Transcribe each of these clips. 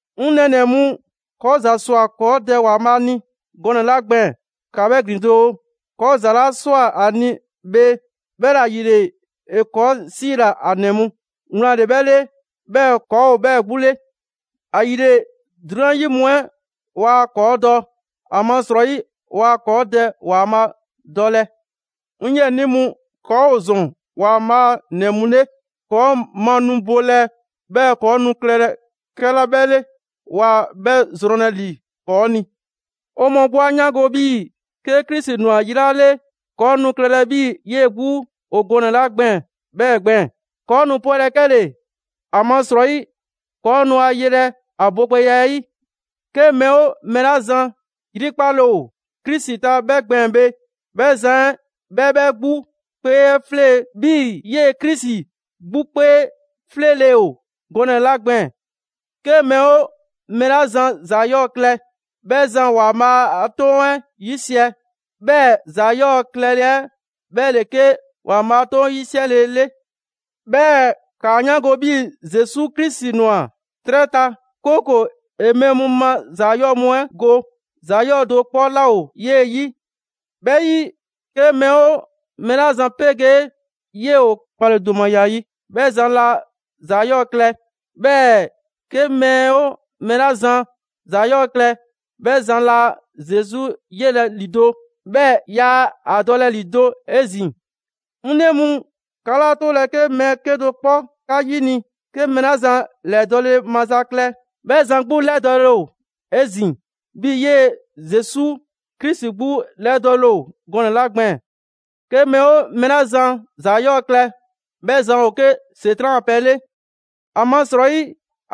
'Ŋ nɛɛnɛ‑ mu, ‑kɔɔ' ‑za ꞊swa ‑kɔɔ' Dɛ ‑Waanbhaa' ni gɔnɛ‑ 'la gbɛɛn‑, ‑ka 'bhɛ ‑glin doo! ‑Kɔɔ' ‑za 'la ꞊swa ‑a ni bhe, 'bhɛla‑ ‑yile ‑e ‑kɔɔ' 'siila‑ ‑a ‑nɛ mu. Wlan ‑le 'bhɛ 'le 'bhɛɛ‑ ‑kɔɔ' ‑o 'bhɛɛ‑ 'gbu 'le. ‑Ayile 'drunyan 'yi mu 'ɛ waa ‑kɔɔ' dɔ; ‑amasrɔyi waa ‑kɔɔ' Dɛ ‑Waanbhaa' dɔlɛ. 'Ŋ 'yiɛnii mu, ‑kɔɔ' ‑o ‑zɔn ‑Waanbhaa' a ‑nɛ mu 'le. ‑Kɔɔ' ma nu bɔɔlɛ 'bhɛɛ‑ ‑kɔɔ' nu klɛlɛ 'kɛla 'bhɛ 'le, waa 'bhɛ zrɔnlɛ ‑li ‑kɔɔ' ni. 'O mɔɔ 'gbu 'a 'yaango‑ 'bhii‑ 'ke Krisi ‑nwa yi 'la 'le, ‑kɔɔ' nu klɛlɛ 'bhii‑ 'yee‑ 'gbu ‑o gɔnɛ‑ 'la gbɛɛn‑ 'bhɛɛ‑ gbɛɛn‑. ‑Kɔɔ' nu 'pwɛlɛ‑ 'kɛle‑, ‑amasrɔyi ‑kɔɔ' nu ‑a yelɛ ‑a bogbɛya 'ɛ 'yi. 'Ke mɛɛ 'oo mɛɛ 'la zan yrikpale ‑o Krisi ta 'bhɛ gbɛɛn‑ bhe, 'bhɛ zan 'ɛ 'bhɛ 'bhɛ 'gbu 'kpee 'ɛ 'flee‑ 'bhii‑ 'yee‑ Krisi 'gbu 'kpee 'fleele‑ ‑o gɔnɛ‑ 'la gbɛɛn‑. 'Ke mɛɛ 'oo mɛɛ 'la zan ‑za 'yɔɔ‑ klɛ, 'bhɛ zan ‑Waanbhaa' a 'Toŋ 'ɛ 'yisiɛ. 'Bhɛɛ‑ ‑za 'yɔɔ‑ klɛle 'ɛ 'bhɛ ‑le 'ke ‑Waanbhaa' a 'Toŋ 'yisiɛle 'ɛ 'le. 'Bhɛɛ‑ 'kaa 'yaango‑ 'bhii‑ Zesu Krisi ‑nwa 'trɛ ta, 'kooko‑ ‑e mɛɛ mu ma ‑za 'yɔɔ‑ mu 'ɛ go. ‑Za 'yɔɔ‑ do 'kpɔ 'laa ‑o 'yee‑ ‑yi. 'Bhɛ 'yi, 'ke mɛɛ 'oo mɛɛ 'la zan 'pegee 'yee‑ ‑o 'kpaledomaya 'yi, 'bhɛ zan laa ‑za 'yɔɔ‑ klɛ. 'Bhɛɛ‑ 'ke mɛɛ 'oo mɛɛ 'la zan ‑za 'yɔɔ‑ klɛ, 'bhɛ zan laa Zesu yelɛ ‑lido', 'bhɛɛ‑ yaa ‑a dɔlɛ ‑lido' 'ezin‑. 'Ŋ 'nɛ mu, 'ka 'laa 'tolɛ‑ 'ke mɛɛ 'kedo‑ 'kpɔ 'ka 'yini‑. 'Ke mɛɛ 'la zan ‑lɛdɔɔle maza klɛ, 'bhɛ zan 'gbu 'lɛdɔɔle ‑o 'ezin‑, 'bhii‑ 'yee‑ Zesu Krisi 'gbu 'lɛdɔɔle ‑o gɔnɛ 'la gbɛɛn‑. 'Ke mɛɛ 'oo mɛɛ 'la zan ‑za 'yɔɔ‑ klɛ, 'bhɛ zan ‑o 'ke ‑Setran' a pɛ 'le. ‑Amasrɔyi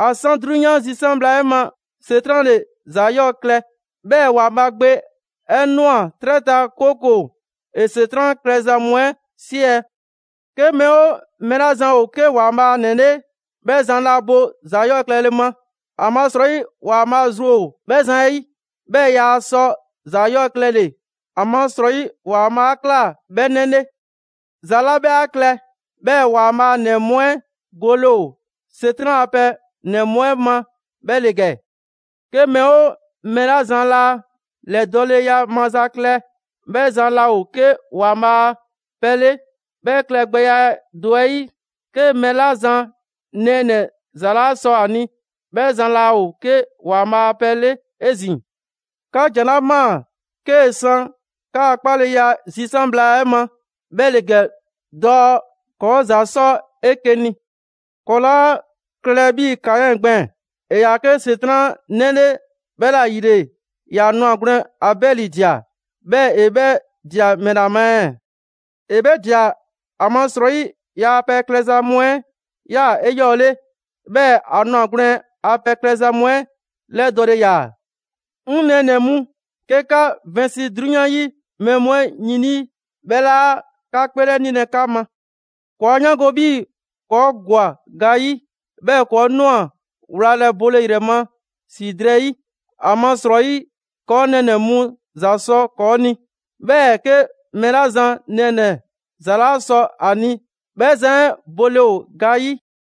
‑a 'san 'drunyan zisan' bhla 'ɛ ma, ‑Setran' ‑le ‑za 'yɔɔ‑ klɛ. 'Bhɛɛ‑ ‑Waanbhaa' Gbe 'ɛ ꞊nwa 'trɛ ta, 'kooko‑ ‑e ‑Setran' klɛza mu 'ɛ 'siɛ‑. 'Ke mɛɛ 'oo mɛɛ 'la zan ‑o 'ke ‑Waanbhaa' ‑nɛ 'le, 'bhɛ zan laa bo ‑za 'yɔɔ‑ klɛle ma, ‑amasrɔyi ‑Waanbhaa' zru ‑o 'bhɛ zan 'ɛ 'yi. 'Bhɛɛ‑ yaa sɔ ‑za 'yɔɔ‑ klɛle‑, ‑amasrɔyi ‑Waanbhaa' 'a ꞊kla 'bhɛ 'nɛ 'le. ‑Za 'la 'bhɛ 'a klɛ 'bhɛɛ‑ ‑Waanbhaa' ‑nɛ mu 'ɛ gole ‑o ‑Setran' a pɛ ‑nɛ mu 'ɛ ma 'bhɛ ‑le ‑gɛ: 'ke mɛɛ 'oo mɛɛ 'la zan laa ‑lɛdɔɔleya maza klɛ, 'bhɛ zan laa ‑o 'ke ‑Waanbhaa' a pɛ 'le. 'Bhɛ klɛgbɛya do 'ɛ 'yi, 'ke mɛɛ 'la zan nɛɛnɛ‑ ‑za 'laa sɔ ‑a ni, 'bhɛ zan laa ‑o 'ke ‑Waanbhaa' a pɛ 'le 'ezin‑. 'Ka ‑jan 'la ꞊maa 'kee san 'ka 'kpaleya 'ɛ zisan' bhla 'ɛ ma 'bhɛ ‑le ‑gɛ dɔɔ: ‑kɔɔ' ‑za 'sɔ 'eke‑ ni. ‑Kɔɔ' 'laa klɛlɛ 'bhii‑ Kaɛn gbɛɛn‑. ‑E ‑yaa 'ke ‑Setran' 'nɛ 'le 'bhɛla‑ ‑yile ‑ya 'nwagwlɛn‑ Abɛli ꞊dia. 'Bhɛɛ‑ ‑e 'bhɛ ꞊dia ‑mɛla ma ɛɛ? ‑E 'bhɛ ꞊dia, ‑amasrɔyi ‑yaa' pɛ klɛza mu 'ɛ 'yaa‑ 'eyɔɔle, 'bhɛɛ‑ ‑a 'nwagwlɛn‑ a pɛ klɛza mu 'ɛ 'lɛdɔɔle ‑yaa. 'Ŋ 'nɛɛnɛ‑ mu, 'ke 'ka vɛnsi 'drunyan 'yi mɛɛ mu 'ɛ yin 'lii, 'bhɛ 'laa 'ka 'kpeelɛnilɛ 'ka ma. ‑Kɔɔ' 'a 'yaango‑ 'bhii‑ ‑kɔɔ' ‑gwa ga 'yi, 'bhɛɛ‑ ‑kɔɔ' ꞊nwa wlalɛ bole ‑yrɛ ma ‑si drɛɛ 'yi, ‑amasrɔyi ‑kɔɔ' nɛɛnɛ‑ mu ‑za sɔ ‑kɔɔ' ni. 'Bhɛɛ‑ 'ke mɛɛ 'la zan nɛɛnɛ‑ ‑za 'laa sɔ ‑a ni, 'bhɛ zan 'ɛ bole ‑o ga 'yi.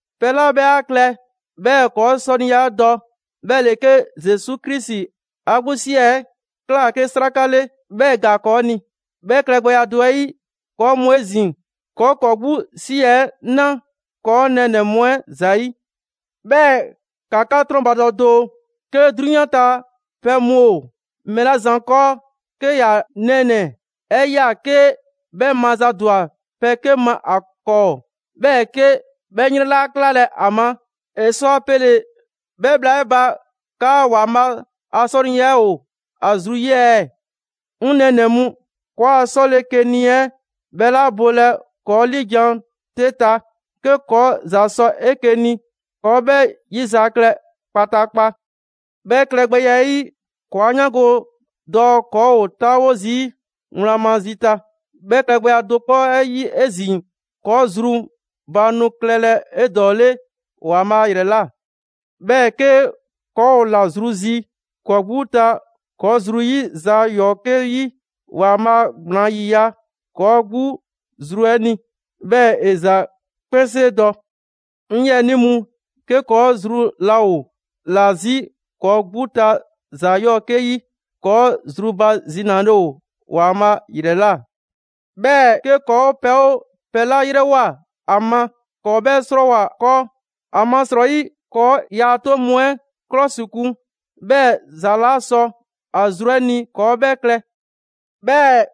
Pɛ 'la 'bhɛ 'a klɛ 'bhɛɛ‑ ‑kɔɔ' 'sɔniya 'ɛ dɔ, 'bhɛ ‑le 'ke Zesu Krisi 'a 'gbu ‑si 'ɛ ꞊kla 'ke 'sraka 'le, 'bhɛɛ‑ ‑e ‑gaa ‑kɔɔ' ni. 'Bhɛ klɛgbɛya do 'ɛ 'yi, ‑kɔɔ' mu 'ezin‑, ‑kɔɔ' ‑kɔɔ' 'gbu ‑si 'ɛ 'na ‑kɔɔ' nɛɛnɛ‑ mu 'ɛ ‑zayi'. 'Bhɛɛ‑ ‑ka 'ka 'trɔnbadɔ doo! 'Ke 'drunyan ta pɛ mu ‑o mɛɛ 'la zan 'kɔɔ, 'ke ‑ya nɛɛnɛ‑ 'ɛ ꞊ya 'ke 'bhɛ mazadwa pɛ 'ke ma ‑a 'kɔɔ, 'bhɛɛ‑ 'ke 'bhɛ 'yrɛn 'laa 'klalɛ‑ a ma; ‑e sɔ a pele‑ 'bhɛ bhla 'ɛ ba 'kaa ‑Waanbhaa' a 'sɔniya ‑o ‑a zru 'ɛ 'yi ɛɛ? 'Ŋ 'nɛ mu, ‑kɔɔa' 'sɔle‑ 'ke ni 'ɛ 'bhɛ 'laa bolɛ ‑kɔɔ' 'liijan‑ 'te ta. 'Ke ‑kɔɔ' ‑za sɔ 'eke‑ ni, ‑kɔɔ' 'bhɛ 'yizaklɛ kpataakpa. 'Bhɛ klɛgbɛya 'ɛ 'yi, ‑kɔɔ' 'a 'yaango‑ dɔɔ ‑kɔɔ' ‑o 'taawo zii' wlan ma zi ta. 'Bhɛ klɛgbɛya do 'kpɔ 'ɛ 'yi 'ezin‑ ‑kɔɔ' zru ba nu klɛlɛ 'edɔɔle ‑Waanbhaa' ‑yrɛ ꞊la. 'Bhɛɛ‑ 'ke ‑kɔɔ' ‑o ‑la zru 'zi ‑kɔɔ' 'gbu ta ‑kɔɔ' zru ‑yi ‑za 'yɔɔ‑ 'ke 'yi, Waanbhaa' gblaan ‑yiya' ‑kɔɔ' 'gbu zru 'ɛ ni, 'bhɛɛ‑ ‑e ‑za 'kpɛnsee dɔ. 'Ŋ 'yiɛnii mu, 'ke ‑kɔɔ' zru laa ‑o ‑la 'zi ‑kɔɔ' 'gbu ta ‑za 'yɔɔ‑ 'ke 'yi, ‑kɔɔ' zrubazinale ‑o ‑Waanbhaa' ‑yrɛ ꞊la. 'Bhɛɛ‑ 'ke ‑kɔɔ' pɛ 'oo pɛ 'la 'yrɛwoa‑ ‑a ma, ‑kɔɔ' 'bhɛ 'srɔɔwo‑ ‑a 'kɔɔ. ‑Amasrɔyi, ‑kɔɔ' ‑yaa' 'toŋ mu 'ɛ 'klɔsikun, 'bhɛɛ‑ ‑za 'la sɔ ‑a zru 'ɛ ni ‑kɔɔ' 'bhɛɛ‑ klɛ. 'Bhɛɛ‑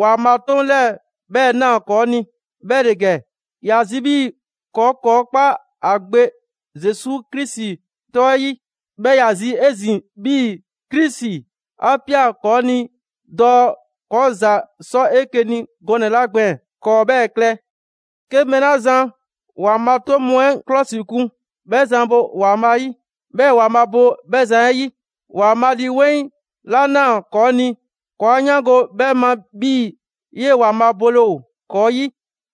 ‑Waanbhaa' 'toŋ 'lɛɛ‑ 'bhɛɛ‑ ꞊naa ‑kɔɔ ni, 'bhɛ ‑le ‑gɛ: ‑ya zi 'bhii‑ ‑kɔɔ' ‑kɔɔ' 'kpa ‑a Gbe Zesu Krisi 'tɔ 'ɛ 'yi. 'Bhɛɛ‑ ‑ya zi 'ezin‑ 'bhii‑ Krisi 'a ꞊pia ‑kɔɔ' ni dɔɔ ‑kɔɔ' ‑za 'sɔ 'eke‑ ni gɔnɛ‑ 'la gbɛɛn‑, ‑kɔɔ' 'bhɛɛ‑ klɛ. 'Ke mɛɛ 'la zan ‑Waanbhaa' 'toŋ mu 'ɛ 'klɔsikun, 'bhɛ zan bo ‑Waanbhaa' 'yi, 'bhɛɛ‑ ‑Waanbhaa' bo 'bhɛ zan 'ɛ ‑yi. ‑Waanbhaa' Lii 'Weŋ 'la ꞊naa ‑kɔɔ' ni, ‑kɔɔ' 'a 'yaango‑ 'bhɛɛ‑ ma 'bhii‑ 'yee‑ ‑Waanbhaa' bole ‑o ‑kɔɔ' 'yi.